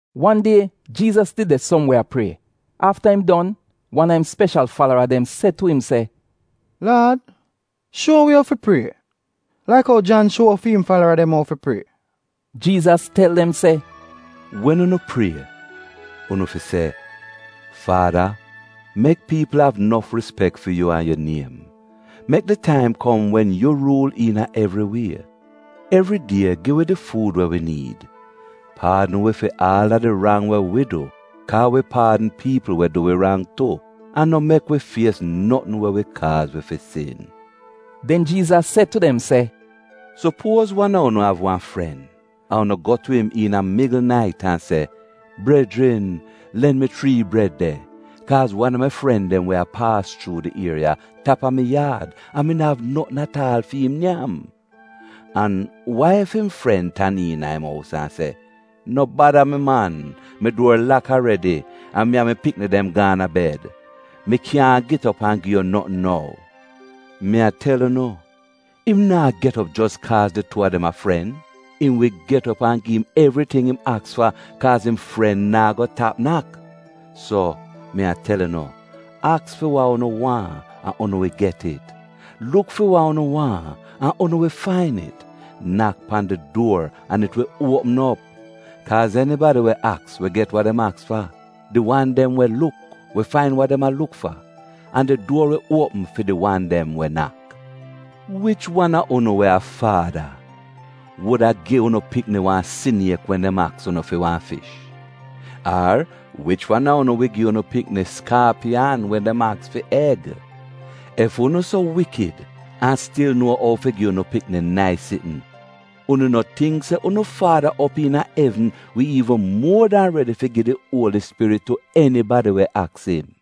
Wan die Jiizas did de som we a prie. Afta im don, wan a im speshal falara dem se tu im se, “Laad, shuo wi ou fi prie, laik ou Jan shuo fi im falara dem ou fi prie.” Jiizas tel dem se, “Wen unu prie, unu fi se: “ ‘Faada, mek piipl av nof rispek fi yu an yu niem, Mek di taim kom wen yu ruul iina evri wie. Evridie gi wi di fuud we wi niid Paadn wi fi aal a di rang we wi du, ka wi paadn piipl we du wi rang tu. An no mek wi fies notn we wi kaaz wi fi sin.’” Den Jiizas se tu dem se, “Supuoz wan a unu av wan fren, an unu go tu im iina migl nait an se, ‘Brejrin len mi chrii bred de, kaaz wan a mi fren dem we a paas chuu di ieriya tap a mi yaad, an mi no av notn at aal fi'im nyam.’ “An wa ef im fren tan iina im ous an se, ‘No bada mi man. Mi duor lak aredi, an mi an mi pikni dem gaan a bed. Mi kyaahn get op an gi yu notn nou.’ Mi a tel unu, im naa get op jos kaaz di tuu a dem a fren, im wi get op an gi im evriting im aks fa kaaz im fren naa go tap nak. “So, mi a tel unu. Aks fi wa unu waahn an unu wi get it, luk fi wa unu waahn an unu wi fain it; nak pan di duor an it wi uopm op. Kaaz enibadi we aks wi get wa dem aks fa, di wan dem we luk wi fain wa dem a luk fa, an di duor wi uopm fi di wan dem we nak. “Wich wan a unu we a faada, wuda gi unu pikni wan siniek wen dem aks unu fi wan fish? Ar wich wan a unu wi gi unu pikni skaapiyan, wen dem aks fi eg? Ef unu so wikid an stil nuo ou fi gi unu pikni nais sitn, unu no tingk se unu Faada op iina evn wi iivn muo dan redi fi gi di Uoli Spirit tu enibadi we aks im!”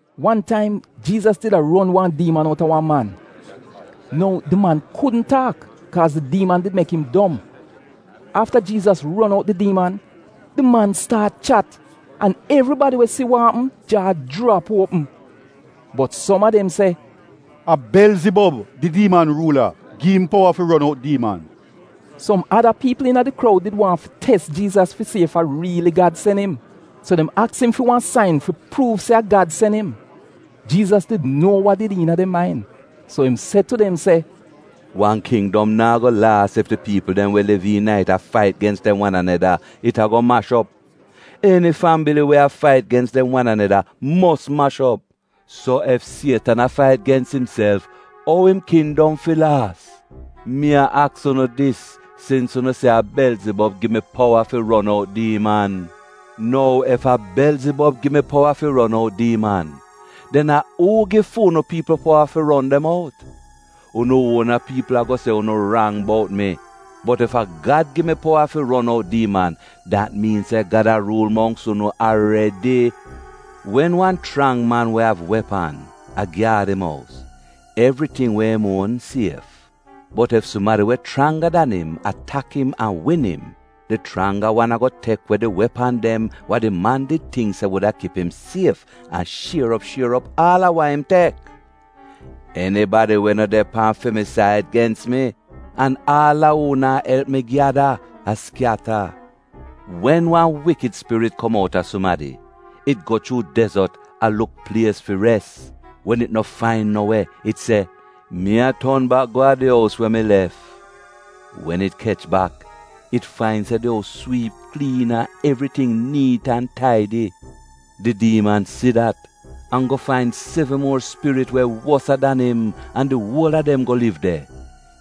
Wan taim Jiizas did a ron wan diiman outa wan man. Nou, di man kudn taak kaaz di diiman did mek im dom. Afta Jiizas ron out di diiman, di man staat chat, an evribadi we si wa apm jaa jrap uopm. Bot som a dem se, “A Belzibob, di diiman ruula, gi im powa fi ron out diiman.” Som ada piipl iina di kroud did waahn fi tes Jiizas fi si ef a riili Gad sen im. So dem aks im fi wan sain fi pruuv se a Gad sen im. Jiizas did nuo wa did de iina dem main, so im se tu dem se: “Wan kindom naa go laas ef di piipl dem we liv iina it a fait gens dem wan aneda, it ago mash op. Eni fambili we a fait gens dem wan aneda mos mash op. So, ef Sietan a fait gens imself, ou im kindom fi laas? Mi a aks unu dis sins unu se a Belzibob gi mi powa fi ron out diiman. Nou, ef a Belzibob gi mi powa fi ron out diiman, den a uu gi fu'unu piipl powa fi ron dem out? Unu uona piipl ago se unu rang bout mi. Bot ef a Gad gi mi powa fi ron out diiman, dat miin se Gad a ruul mongks unu aredi. “Wen wan chrang man we av wepan, a gyaad im ous, evriting we im uon sief. Bot ef sumadi we chranga dan im, atak im an win im, di chranga wan ago tek we di wepan dem wa di man did tingk se wuda kip im sief, an shier op shier op aal a wa im tek. “Enibadi we no de pan fi mi said, gens mi, an aal a uu naa elp mi gyada, a skyata. “Wen wan wikid spirit kom outa sumadi, it go chuu dezot, a luk plies fi res. Wen it no fain no we, it se ‘Mi a ton bak go a di ous we mi lef.’ Wen it kech bak, it fain se di ous swiip kliin an evriting niit an taidi Di diiman si dat, an go fain sevn muor spirit we wosa dan im an di uol a dem go liv de.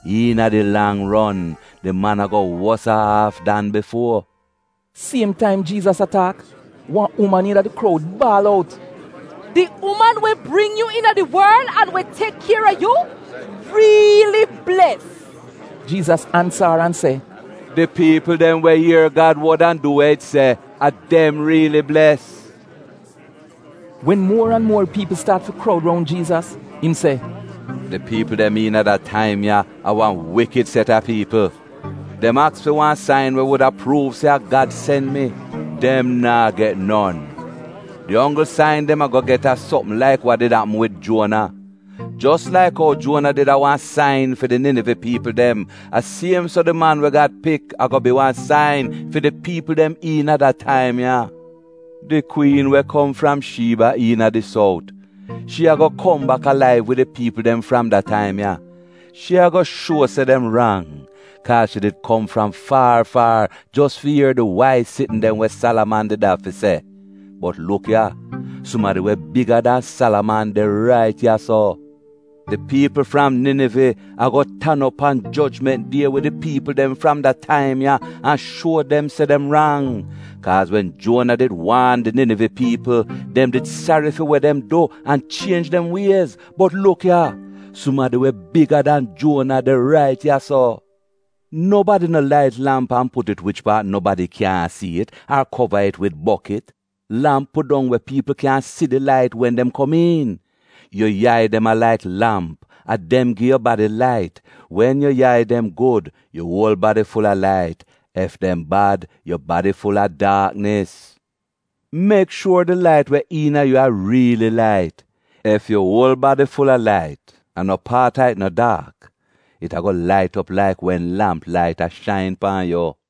Iina di lang ron, di man ago wosa aaf dan bifuo.” Siem taim Jiizas a taak, wan uman iina di kroud baal out, “Di uman we bring yu iina di worl an we tek kier a yu, riili bles.” Jiizas ansa ar an se, “Di piipl dem we ier Gad wod an du we it se, a dem riili bles.” Wen muor an muor piipl staat fi kroud roun Jiizas, im se, “Di piipl dem iina da taim ya, a wan wikid set a piipl. Dem aks fi wan sain we wuda pruuv se a Gad sen mi. Dem naa get non! Di onggl sain dem ago get a sopm laik wa did apm wid Juona. Jos laik ou Juona did a wan sain fi di Ninive piipl dem, a siem so di Man we Gad Pik ago bi wan sain fi di piipl dem iina da taim ya. Di kwiin we kom fram Shiiba iina di sout, shi ago kom bak alaiv wid di piipl dem fram da taim ya. Shi ago shuo se dem rang, kaaz shi did kom fram faar faar jos fi ier di waiz sitn dem we Salaman did av fi se. Bot luk ya, sumadi we biga dan Salaman de rait ya-so. Di piipl fram Ninive, ago tan op pan jojment die wid di piipl dem fram da taim ya an shuo dem se dem rang. Kaaz wen Juona did waan di Ninive piipl, dem did sari fi we dem du an chienj dem wiez. Bot luk ya, sumadi we biga dan Juona de rait ya-so. “Nobadi no lait lamp an put it wich paat nobadi kyaahn si it ar kova it wid bokit. Lamp pudong we piipl kyan si di lait wen dem kom iin. Yu yai dem a laik lamp, a dem gi yu badi lait. Wen yu yai dem gud, yu uol badi ful-a lait. Ef dem bad, yu badi ful-a daaknis. Mek shuor di lait we iina yu a riili lait. Ef yu uol badi ful-a lait, an no paat a it no daak, it ago lait op laik wen lamp lait a shain pan yu.”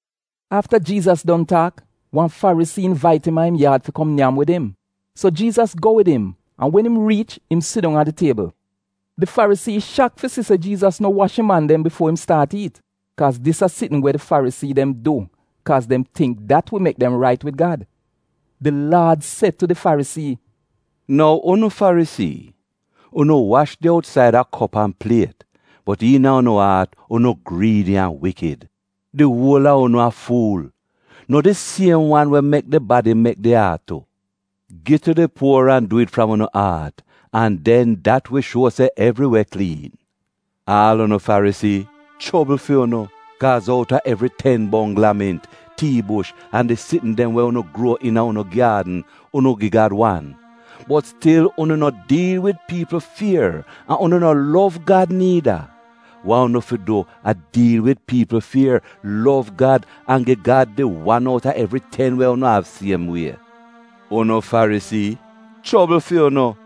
Afta Jiizas don taak, wan Farisii invait im a im yaad fi kom nyam wid im. So Jiizas go wid im an wen im riich im sidong a di tiebl. Di Farisii shak fi si se Jiizas no wash im an dem bifuo im staat iit (kaaz dis a sitn we di Farisii dem du kaaz dem tingk dat wi mek dem rait wid Gad). Di Laad se tu di Farisii, “Nou unu Farisii, unu wash di outsaida kop an pliet, bot iina unu aat, unu griidi an wikid. Di uol a unu a fuul! No di siem wan we mek di badi mek di aat tu? Gi tu di puor an du it fram unu aat, an den dat wi shuo se evri we kliin. “Aal unu Farisii — Chobl fi unu, kaaz outa evri ten bongl a mint, tii bush an di sitn dem we unu gruo iina unu gyaadn, unu gi Gad wan. Bot stil unu no diil wid piipl fier an unu no lov Gad niida. Wa unu fi du a diil wid piipl fier, lov Gad an gi Gad di wan outa evri ten we unu av siem wie. “Unu Farisii — chobl fi unu!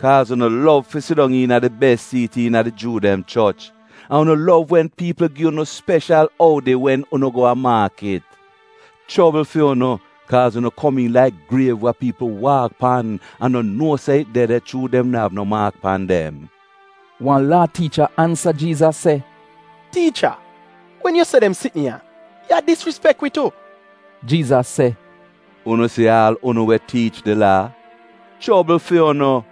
Kaaz unu lov fi sidong iina di bes siit iina di Juu dem choch. An unu lov wen piipl gi unu speshal oudi wen unu go a maakit. “Chobl fi unu, kaaz unu komiin laik griev wa piipl waak pan an no nuo se it de de, chuu dem no av no maak pan dem.” Wan Laa tiicha ansa Jiizas se, “Tiicha, wen yu se dem sitn ya, yu a disrispek wi tu.” Jiizas se, “Unu si aal unu we tiich di Laa — chobl fi unu!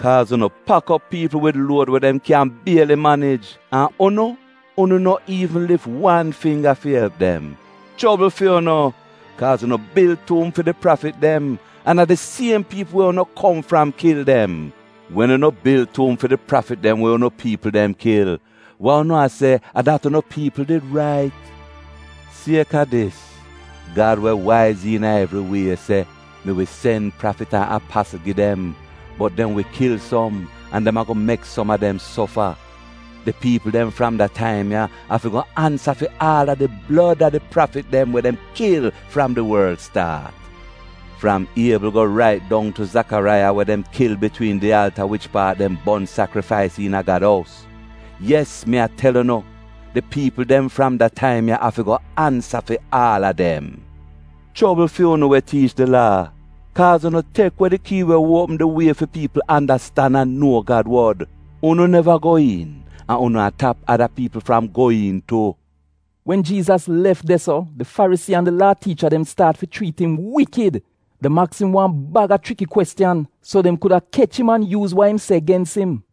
Kaaz unu pak op piipl wid luod we dem kyan bieli manij, an unu, unu no iivn lif wan fingga fi elp dem. “Chobl fi unu, kaaz unu bil tuum fi di prafit dem, an a di siem piipl we unu kom fram kil dem. Wen unu bil tuum fi di prafit dem we unu piipl dem kil, wa unu a se a dat unu piipl did rait. Sieka dis, Gad we waiz iina evri wie se, ‘Mi wi sen prafit an apasl gi dem, bot dem wi kil som, an dem ago mek som a dem sofa.’ Di piipl dem fram de taim ya afi go ansa fi aal a di blod a di prafit dem we dem kil fram di worl staat; fram Iebl go rait dong tu Zakaraiya we dem kil bitwiin di alta wich paat dem bon sakrifais iina Gad ous. Yes mi a tel unu, di piipl dem fram da taim ya afi go ansa fi aal a dem. “Chobl fi unu we tiich di Laa, kaaz unu tek we di kii we uopm di wie fi piipl andastan an nuo Gad wod. Unu neva go iin an unu a tap ada piipl fram go iin tu.” Wen Jiizas lef de-so di Farisii an di Laa tiicha dem staat fi chriit im wikid. Dem aks im wan bag a chriki kwestiyan, so dem kuda kech im an yuuz wa im se gens im.